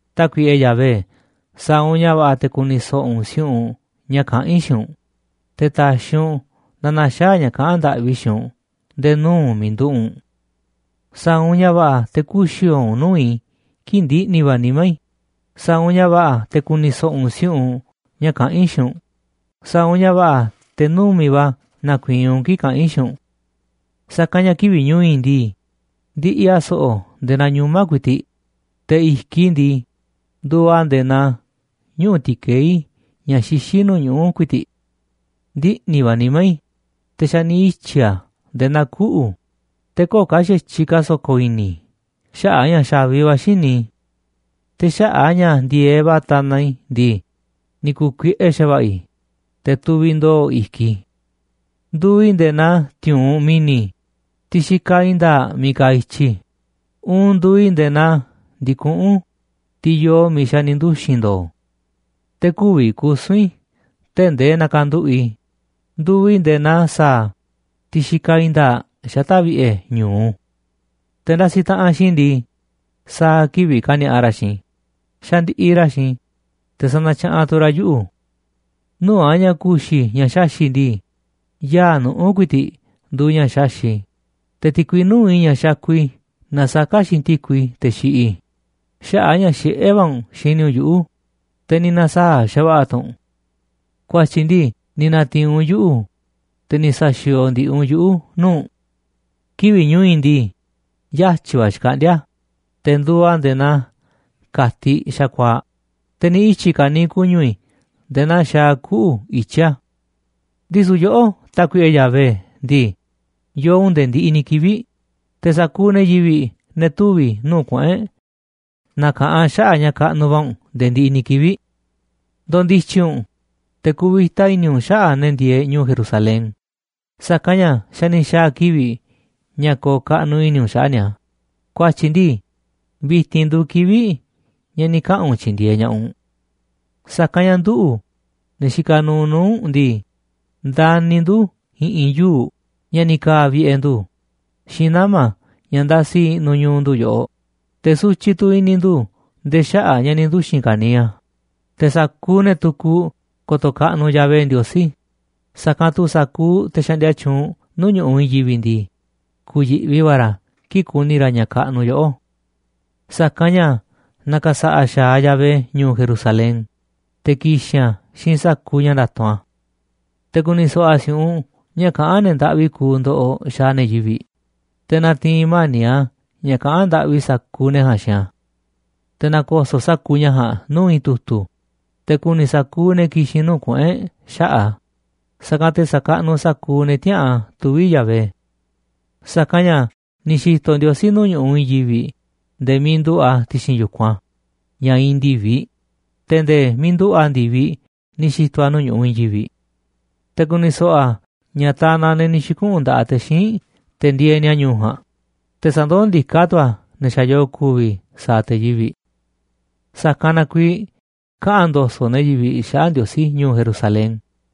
Tákuiꞌe Yahvé, sa̱a̱ u̱nꞌ ña̱ va̱ꞌa̱ te̱ ku̱ni̱ so̱ꞌo̱ u̱nꞌ si̱u̱ꞌunꞌ ña̱ kaꞌán i̱ xiinꞌ u̱nꞌ, te̱ ta̱xi̱ u̱nꞌ na na̱xaa̱ ña̱ kaꞌán ndaꞌvi i̱ xiinꞌ u̱nꞌ nde̱e̱ nuu̱ꞌ u̱nꞌ miiꞌ nduꞌu̱ꞌ u̱nꞌ. Sa̱a̱ u̱nꞌ ña̱ va̱ꞌa̱ te̱ kü̱xi̱o̱o̱ u̱nꞌ nuu̱ꞌ i̱ kii̱ꞌ ndiꞌni̱ va̱ nimá i̱, sa̱a̱ u̱nꞌ ña̱ va̱ꞌa̱ te̱ ku̱ni̱ so̱ꞌo̱ u̱nꞌ si̱u̱ꞌunꞌ ña̱ kaꞌán i̱ xiinꞌ u̱nꞌ, sa̱a̱ u̱nꞌ ña̱ va̱ꞌa̱ te̱ numi̱ꞌ va̱ na̱ku̱i̱i̱n u̱nꞌ kii̱ꞌ kaꞌa̱n i̱ xiinꞌ u̱nꞌ. Sa̱kanꞌ ña̱ kivi̱ꞌ ñu̱u̱ i̱ ndii, ndiꞌiꞌ a̱ so̱ꞌo̱ nde̱e̱ naa ñuꞌma̱ ku̱i̱ti̱ꞌ, te̱ i̱kiꞌ i̱ ndii, nduuꞌ a̱ nde̱e̱ naa ñuꞌu̱ ti̱keí ña̱ xixí nuu̱ꞌ ñuꞌu̱ ku̱i̱ti̱ꞌ. Ndiꞌni̱ va̱ nimá i̱, te̱ xa̱ ni̱ ityi̱ a̱ nde̱e̱ naa kuꞌu̱, te̱ köo̱ꞌ ka̱ xa̱tyiꞌ ka̱ so̱ko̱ i̱ni̱ i̱ xaꞌa̱ꞌ a̱ ña̱ xa̱vi va̱ xíniꞌ i̱. Te̱ xaꞌa̱ꞌ a̱ ña̱ ndi̱e̱eꞌ va̱ tanaꞌ i̱ ndii, ni̱ ku̱u̱ kuiꞌe xa̱va̱ꞌa̱ i̱, te̱ tuviꞌ ndo̱o̱ i̱kiꞌ i̱. Nduuꞌ i̱ nde̱e̱ naa ti̱u̱unꞌ mi̱ni̱, tiꞌ xikaꞌ i̱i̱n nda̱a̱ꞌ miiꞌ kaaꞌ i̱tyi, uun nduuꞌ i̱ nde̱e̱ naa ndi̱kuꞌún, tiꞌ yoo miiꞌ xa̱ ni̱ nduxi̱n ndo̱o̱. Te̱ kü̱vi̱ kusu̱n i̱ tee̱ꞌ ndee nakanduꞌu̱ꞌ i̱, nduuꞌ i̱ nde̱e̱ naa sa̱a̱, tiꞌ xikaꞌ i̱i̱n nda̱a̱ꞌ xata̱ꞌ vi̱ꞌe̱ ñu̱u. Te̱ ndasiꞌ taꞌanꞌ xiinꞌ i̱ ndii, sa̱a̱ kivi̱ꞌ kani̱a̱ꞌa ra̱ xiinꞌ i̱, xandiꞌiꞌ ra̱ xiinꞌ i̱, te̱ sanatyaꞌanꞌ tu̱ ra̱ yuꞌu̱. Nuu̱ꞌ a̱ ña̱ ku̱xi̱ i̱ ña̱ xaxi̱ꞌ ndii, yaa̱ꞌ nuꞌu̱ ku̱i̱ti̱ꞌ nduuꞌ ña̱ xaxi̱ꞌ i̱, te̱ ti̱kui nuu̱ꞌ i̱ ña̱ xakuꞌ i̱ nasaká xiinꞌ ti̱kui, xaꞌa̱ꞌ a̱ ña̱ xiꞌé va̱ u̱nꞌ xini u̱nꞌ yuꞌu̱, te̱ ni̱ na̱saa̱ꞌ xa̱va̱ꞌa̱ tu̱ u̱nꞌ. Ku̱a̱tyi̱ ndii ni̱ na̱ti̱i̱n u̱nꞌ yuꞌu̱, te̱ ni̱ sa̱xi̱o̱o̱ ndi̱ꞌi̱ u̱nꞌ yuꞌu̱ nuu̱ꞌ u̱nꞌ. Kivi̱ꞌ ñu̱u̱ i̱ ndii, yatyi̱ va̱ xkaꞌndíá a̱, te̱ nduuꞌ a̱ nde̱e̱ naa ka̱tiꞌ xa̱kuaa̱ꞌ, te̱ ni̱ ityi̱ ka̱niiꞌ ku̱ñu̱ i̱ nde̱e̱ naa xaaꞌ kuꞌu̱ i̱tyi a̱. Ndisu̱ yoꞌó, Tákuiꞌe Yahvé ndii, yoo u̱nꞌ nde̱e̱ ndiꞌiꞌ ni̱ kivi̱ꞌ, te̱ sa̱kuuꞌ ne̱ yivi̱ꞌ, ne̱ tuvi̱ nuu̱ꞌ kuꞌu̱n e̱ꞌ, na̱ka̱ꞌanꞌ xaꞌa̱ꞌ ña̱ kaꞌnuꞌ va̱ u̱nꞌ nde̱e̱ ndiꞌiꞌ ni̱ kivi̱ꞌ. Ndo̱ndi̱tyi̱ u̱nꞌ, te̱ ku̱vi̱ta i̱ni̱ u̱nꞌ xaꞌa̱ꞌ ne̱ ndieeꞌ ñu̱u̱ Jerusalén, sa̱kanꞌ ña̱ xa̱ ni̱ xa̱a̱ kivi̱ꞌ ña̱ ko̱o̱ kaꞌnuꞌ i̱ni̱ u̱nꞌ xaꞌa̱ꞌ ni̱a̱, ku̱a̱tyi̱ ndii, vi̱ti̱n nduuꞌ kivi̱ꞌ ña̱ ni̱ kaꞌa̱n u̱nꞌ tyi̱ndi̱e̱eꞌ ña̱ꞌaꞌ u̱nꞌ. Sa̱kanꞌ ña̱ nduꞌu̱, ne̱ xikaꞌ nuuꞌ nuu̱ꞌ u̱nꞌ ndii, ndani̱ ndu̱ i̱ꞌi̱n yuu̱ꞌ ña̱ ni̱ ka̱a̱ vi̱ꞌe̱ ndu̱ xiinꞌ nama̱ ña̱ ndasiꞌ i̱ꞌnu̱ ñu̱u̱ ndu̱ yoꞌoꞌ, te̱ sutyiꞌ tu̱ i̱ni̱ ndu̱ nde̱e̱ xaꞌa̱ꞌ ña̱ ni̱ nduxi̱n ka̱niiꞌ a̱. Te̱ sa̱kuuꞌ ne̱ tukuꞌ ko̱to̱ kaꞌnuꞌ Yahvé Ndiosí, sa̱kanꞌ tu̱ sa̱kuuꞌ te̱ xaꞌndia tyuunꞌ nuu̱ꞌ ñu̱ꞌuꞌ i̱i̱n yivi̱ꞌ ndii, ku̱yi̱ꞌvi va̱ ra̱ kii̱ꞌ ku̱ni̱ ra̱ ña̱ kaꞌnuꞌ yoꞌó. Sa̱kanꞌ ña̱ na̱ka̱sa̱ꞌa̱ xa̱aꞌ Yahvé ñu̱u̱ Jerusalén, te̱ ki̱xi̱n a̱ xiinꞌ sa̱kuuꞌ ña̱ nda̱tu̱nꞌ a̱. Te̱ ku̱ni̱ so̱ꞌo̱ a̱ si̱u̱ꞌunꞌ ña̱ kaꞌán ne̱ ndaꞌvi kuuꞌ ndoꞌoꞌ xaaꞌ ne̱ yivi̱ꞌ, te̱ na̱ti̱i̱n mani̱ꞌ a̱ ña̱ kaꞌa̱n ndaꞌvi sa̱kuuꞌ ne̱ ja̱a̱nꞌ xiinꞌ a̱. Te̱ na̱ko̱so̱ꞌ sa̱kuuꞌ ña̱ ja̱a̱nꞌ nuu̱ꞌ i̱i̱n tu̱tu̱, te̱ ku̱ni̱ sa̱kuuꞌ ne̱ ki̱xi̱n nuu̱ꞌ kuꞌu̱n e̱ꞌ xaꞌa̱ꞌ a̱, sa̱kanꞌ te̱ sa̱kaꞌnuꞌ sa̱kuuꞌ ne̱ tïaꞌa̱an tuvi̱ Yahvé. Sa̱kanꞌ ña̱ ni̱ xi̱to̱ Ndiosí nuu̱ꞌ ñu̱ꞌuꞌ i̱i̱n yivi̱ꞌ nde̱e̱ miiꞌ nduꞌu̱ꞌ a̱ ti̱xi̱n yu̱kunꞌ a̱ ña̱ iinꞌ ndi̱viꞌ, te̱ nde̱e̱ miiꞌ nduꞌu̱ꞌ a̱ ndi̱viꞌ ni̱ xi̱to̱ a̱ nuu̱ꞌ ñu̱ꞌuꞌ i̱i̱n yivi̱ꞌ. Te̱ ku̱ni̱ so̱ꞌo̱ a̱ ña̱ tanaꞌ ne̱ ni̱ xi̱kuꞌu̱n nda̱ꞌaꞌ te̱ xíinꞌ te̱ ndieeꞌ ni̱a̱ ñu̱u̱ ja̱a̱nꞌ, te̱ sa̱ndoó ndiká tu̱ a̱ ne̱ xa̱ yoo ku̱vi̱ sa̱a̱ te̱ yivi̱. Sa̱kanꞌ na kuiiꞌ kaꞌa̱n ndo̱so̱ꞌ ne̱ yivi̱ꞌ xaꞌa̱ꞌ Ndiosí ñu̱u̱ Jerusalén,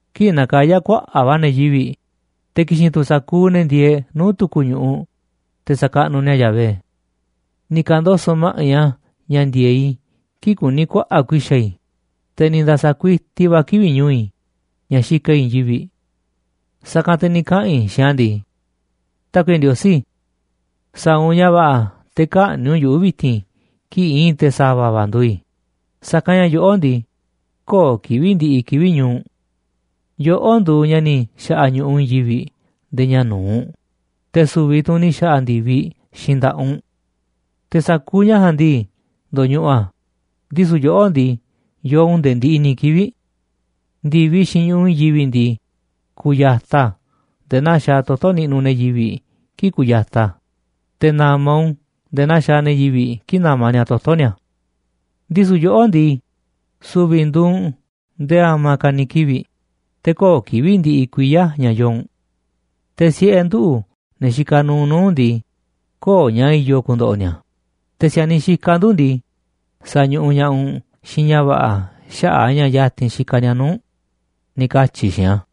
kii̱ꞌ na̱kaya̱ kuaꞌa̱ꞌ va̱ ne̱ yivi̱ꞌ, te̱ ki̱xi̱n tu̱ sa̱kuuꞌ ne̱ ndieeꞌ nuu̱ꞌ tu̱ku̱ ñu̱ꞌuꞌ, te̱ sakaꞌnuꞌ ni̱a̱ Yahvé. Ni̱ ka̱ndoso̱ꞌ ma̱ꞌiꞌ a̱ ña̱ ndi̱e̱eꞌ i̱ kii̱ꞌ kuní kuaꞌa̱ꞌ ku̱i̱xa̱ i̱, te̱ ni̱ nda̱sa̱ kuiti va̱ a̱ kivi̱ꞌ ñu̱u̱ i̱ ña̱ xikaꞌ i̱ i̱i̱n yivi̱ꞌ. Sa̱kanꞌ te̱ ni̱ kaꞌa̱n i̱ xiinꞌ a̱ ndii: “Tákuiꞌe Ndiosí, sa̱a̱ u̱nꞌ ña̱ va̱ꞌa̱ te̱ kä̱ꞌni̱ꞌ u̱nꞌ yuꞌu̱ vi̱ti̱n kii̱ꞌ i̱i̱n te̱ sa̱va̱ va̱ nduuꞌ i̱, sa̱kanꞌ ña̱ yoꞌó ndii, köo̱ꞌ kivi̱ꞌ ndiꞌiꞌ kivi̱ꞌ ñu̱u̱ u̱nꞌ. Yoꞌó nduuꞌ ña̱ ni̱ xa̱ꞌa̱ ñu̱ꞌuꞌ i̱i̱n yivi̱ꞌ nde̱e̱ ña̱ nu̱uꞌ, te̱ su̱vi̱ tu̱ u̱nꞌ ni̱ xa̱ꞌa̱ ndi̱viꞌ xiinꞌ nda̱ꞌaꞌ u̱nꞌ. Te̱ sa̱kuuꞌ ña̱ ja̱a̱nꞌ ndii, ndo̱ñuꞌuꞌ a̱, ndisu̱ yoꞌó ndii, yoo u̱nꞌ nde̱e̱ ndiꞌiꞌ ni̱ kivi̱ꞌ. Ndi̱viꞌ xiinꞌ ñu̱ꞌuꞌ i̱i̱n yivi̱ꞌ ndii, ku̱ya̱taꞌ a̱ nde̱e̱ naa xaaꞌ toto̱ niꞌnuꞌ ne̱ yivi̱ꞌ kii̱ꞌ kuyataꞌ a̱, te̱ na̱ma̱ u̱nꞌ u̱n nde̱e̱ naa xaaꞌ ne̱ yivi̱ꞌ kii̱ꞌ namaꞌ ni̱a̱ toto̱ ni̱a̱. Ndisu̱ yoꞌó ndii, su̱vi̱ nduuꞌ u̱nꞌ nde̱e̱ a̱ma̱ ka̱ ni̱ kivi̱ꞌ, te̱ köo̱ꞌ kivi̱ꞌ ndiꞌiꞌ kuiya̱ ña̱ yoo u̱nꞌ. Te̱ siꞌe̱ nduꞌu̱, ne̱ xikaꞌ nuuꞌ nuu̱ꞌ u̱nꞌ ndii, köo̱ꞌ ña̱ i̱yo̱ ku̱ndo̱ꞌo̱ ni̱a̱, te̱ si̱a̱niꞌ xikaꞌ ndu̱ ndii, sa̱ñuꞌuꞌ ña̱ꞌaꞌ u̱nꞌ xiinꞌ ña̱ va̱ꞌa̱ xaꞌa̱ꞌ a̱ ña̱ ya̱ti̱n xikaꞌ ni̱a̱ nuu̱ꞌ u̱nꞌ”, ni̱ katyi̱ i̱ xiinꞌ a̱.